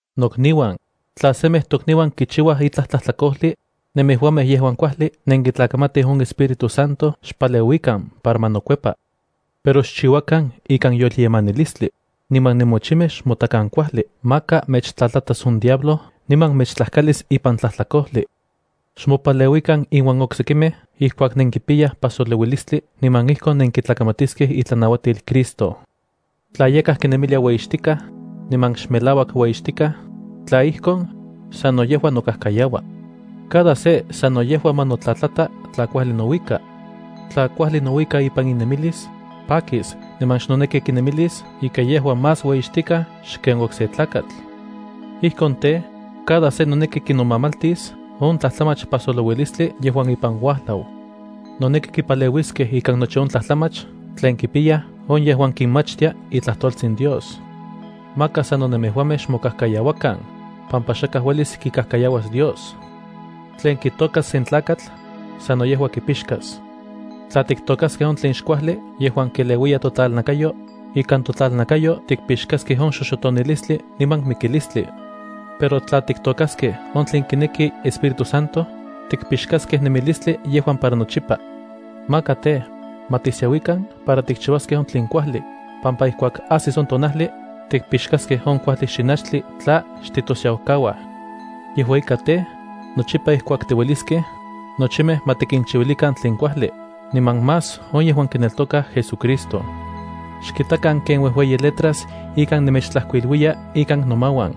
Nokniuan, tla semej tokniuan kichiua itlaj tlajtlakojli, nemejuamej yejuan kuajli nenkitlakamatij on Espíritu Santo xpaleuikan para ma nokuepa. Pero xchiuakan ikan yolyemanilistli, niman nemochimej xmotakan kuajli maka mechtlatlatas on diablo niman mechtlajkalis ipan tlajtlakojli. Xmopaleuikan inuan oksekimej ijkuak nenkipiyaj pasolouilistli, niman ijkon nenkitlakamatiskej itlanauatil Cristo. Tla yakaj kinemilia ueyixtikaj, niman xmelauak ueyixtikaj, tla ijkon, sano yejua nokajkayaua. Cada se sano yejua ma notlatata tla kuajli nouika. Tla kuajli nouika ipan inemilis, pakis niman xnoneki kinemilis ika yejua más ueyixtikaj xken okse tlakatl. Ijkon tej, cada se noneki kinomamaltis on tlajtlamach pajsolouilistli yejuan ipan uajlau. Noneki kipaleuiskej ikan nochi on tlajtlamach tlen kipiyaj on yejuan kinmachtia itlajtoltsin Dios. Maka sano nemejuamej xmokajkayauakan, pampa xakaj uelis kikajkayauas Dios. Tlen kitôkas sen tlakatl, sano yejua kipixkas. Tla tiktôkaskej on tlen xkuajli yejuan keleuiya totlalnakayo, ikan totlalnakayo tikpixkaskej on xoxotonilistli niman mikilistli. Pero tla tiktôkaskej on tlen kineki Espíritu Santo, tikpixkaskej nemilistli yejuan para nochipa. Maka tej, ma tisiauikan para tikchiuaskej on tlen kuajli, pampa ijkuak ajsis on tonajli, tikpixkaskej on kuajli xinachtli tla xtitosiaukauaj. Yejua ika tej, nochipa ijkuak tiueliskej, nochimej ma tikinchiuilikan tlen kuajli, niman más on yejuan kineltokaj JesuCristo. Xkitakan ken uejueyi letras ika nemechtlajkuiluiya ikan nomauan.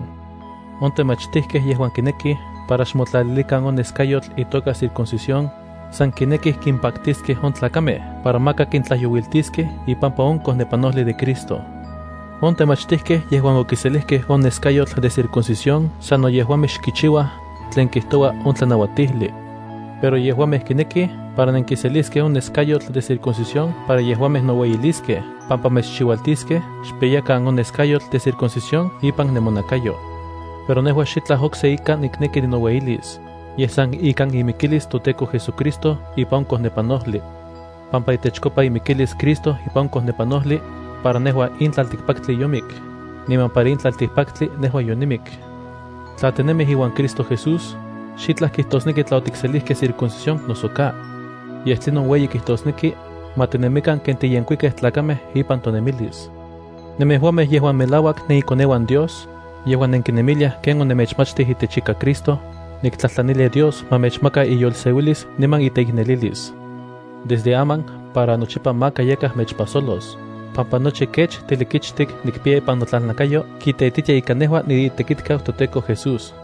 On temachtijkej yejuan kinekij para xmotlalilikan on neskayotl itoka circuncisión, san kinekij kimpaktiskej on tlakamej para maka kintlajyouiltiskej ipampa on kojnepanojli de Cristo. On temachtijkej yejuan okiselijkej on neskayotl de circuncisión sano yejuamej xkichiuaj tlen kijtoua on tlanauatijli. Pero yejuamej kinekij para nenkiseliskej on neskayotl de circuncisión para yejuamej noueyiliskej pampa mechchiualtiskej xpiyakan on neskayotl de circuncisión ipan nemonakayo. Pero nejua xitlaj okse ika nikneki ninoueyilis, yej san ikan imikilis toTEKO JesuCristo ipan on kojnepanojli. Pampa itechkopa imikilis Cristo ipan on kojnepanojli, para nejua in tlaltikpaktli yomik, niman para in tlaltikpaktli nejua yonimik. Tla tinemij iuan Cristo Jesús, xitlaj kijtosneki tla otikselijkej circuncisión noso ka. Yej tlinon ueyi kijtosneki, ma tinemikan ken tiyenkuikej tlakamej ipan tonemilis. Nemejuamej yejuan melauak nenikoneuan Dios, yejuan nenkinemiliaj ken onemechmachtij itechika Cristo, niktlajtlanilia Dios ma mechmaka iyolseuilis niman iteiknelilis. Desde aman para nochipa maka yakaj nechpajsolos, pampa nochi kech tilikichtik nikpiya ipan notlalnakayo kiteititia ika nejua niitekitkau toTEKO Jesús.